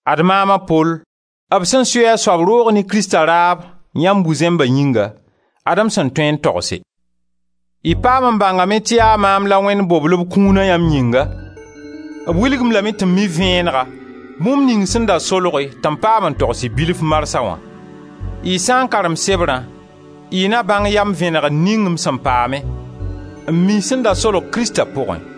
Ad maam a Pol, b sẽn sui a soab roog ne Krista raab yãmb bu-zẽmba yĩnga, ad-m sẽn tõe n togse. Y paam n bãngame tɩ yaa maam la Wẽnd bobl b kũuna yãmb yĩnga, b wilg-m lame tɩ m mi vẽenega bũmb ning sẽn da solge tɩ m paam n togs-y bilf marsã wã. Y sã n karem sebrã y na bãng yam vẽnegre ning m sẽn paame, n mi sẽn da solg Krista pʋgẽ.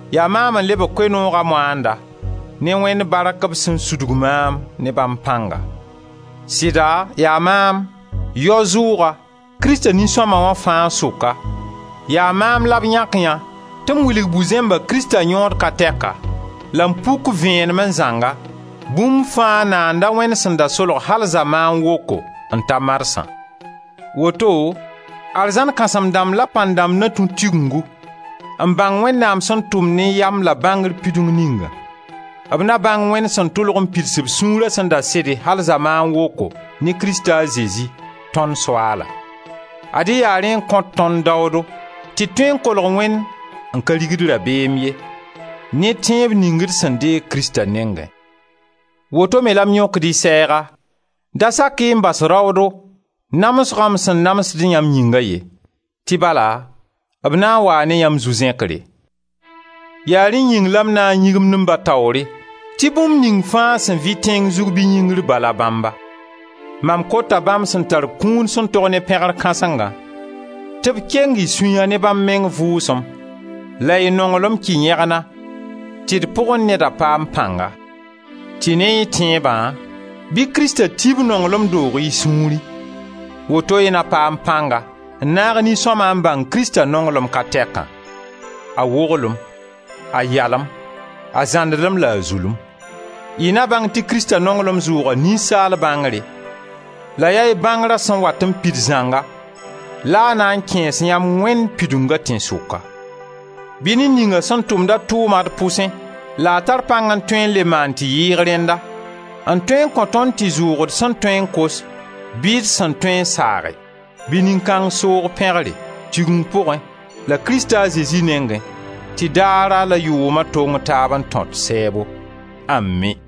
Yaa maam n lebg Koe-nooga moanda ne Wẽnd bark b sẽn sudg maam ne bãmb pãnga. Sɩda yaa maam, yao-zʋʋga, Krista nin-sõma wãa fãa sʋka, yaa maam la b yãk yã tɩ m wilg bu-zẽmba Krista yõod ka tɛka, la m puk vẽenemẽ zãnga bũmb fãa Naanda a Wẽnd sẽn da solge al zamaan woko n ta marsã. Woto, arzãn kãsem-dãmb la pãn-dãmb na tũ Tigengu n bãng Wẽnnaam sẽn tʋm ne yam la bãngr pidung ninga. B na bãng Wẽnd sẽn tʋlg n pids b sũura sẽn da sede al zamaan woko ne Krista a Zezi, tõnd Soaala. Ad-y yaa rẽ n kõt tõnd daoodo tɩ d tõe n kolg Wẽnd n ka rigd rabeem ye, ne tẽeb ning d sẽn deeg Krista nengẽ. Woto me la m yõkd y sɛɛga: da sak-y n bas raoodo, namsgã m sẽn namsd yãmb yĩnga ye, tɩ bala b na n waa ne yamb zu-zẽkre. Yaa rẽ yĩng la n na n yĩgimd m Ba taoore, tɩ bũmb ning fãa sẽn vɩ tẽng zug bɩ yĩngr Ba la bãmba. Mam kota bãmb sẽn tar kũun sẽn tog ne pẽgr kãsengã tɩ b keng y sũya ne bãmb meng Vʋʋsem, la y nonglma kɩ yẽgna tɩ d pʋgẽ neda paam pãnga; tɩ ne y tẽebã, bɩ Krista ti b nonglem doog y sũurẽ. Woto y na paam pãnga, n naag nin-sõma n bãng Krista nonglem ka tɛkã: a woglem, a yalem, a zãndlem la a zulem. Y na bãng tɩ Krista nonglem zʋʋga ninsaal bãngre. La yaa y bãngrã sẽn wat n pid zãnga la a na n kẽes yãmb Wẽnd pidunga tẽnsʋka. Bɩ ned ninga sẽn tʋmda tʋʋma d pʋsẽ la a tar pãng n tõe n le maan tɩ yɩɩg rẽnda, n tõe n kõ tõnd tɩ zʋʋg d sẽn tõe n kos bɩ d sẽn tõe n saage, bɩ nin-kãng soog pẽgre, Tigeng pʋgẽ la Krista a Zezi nengẽ, tɩ daara la yʋʋma tong taab n tõt sɛɛbo! Ami!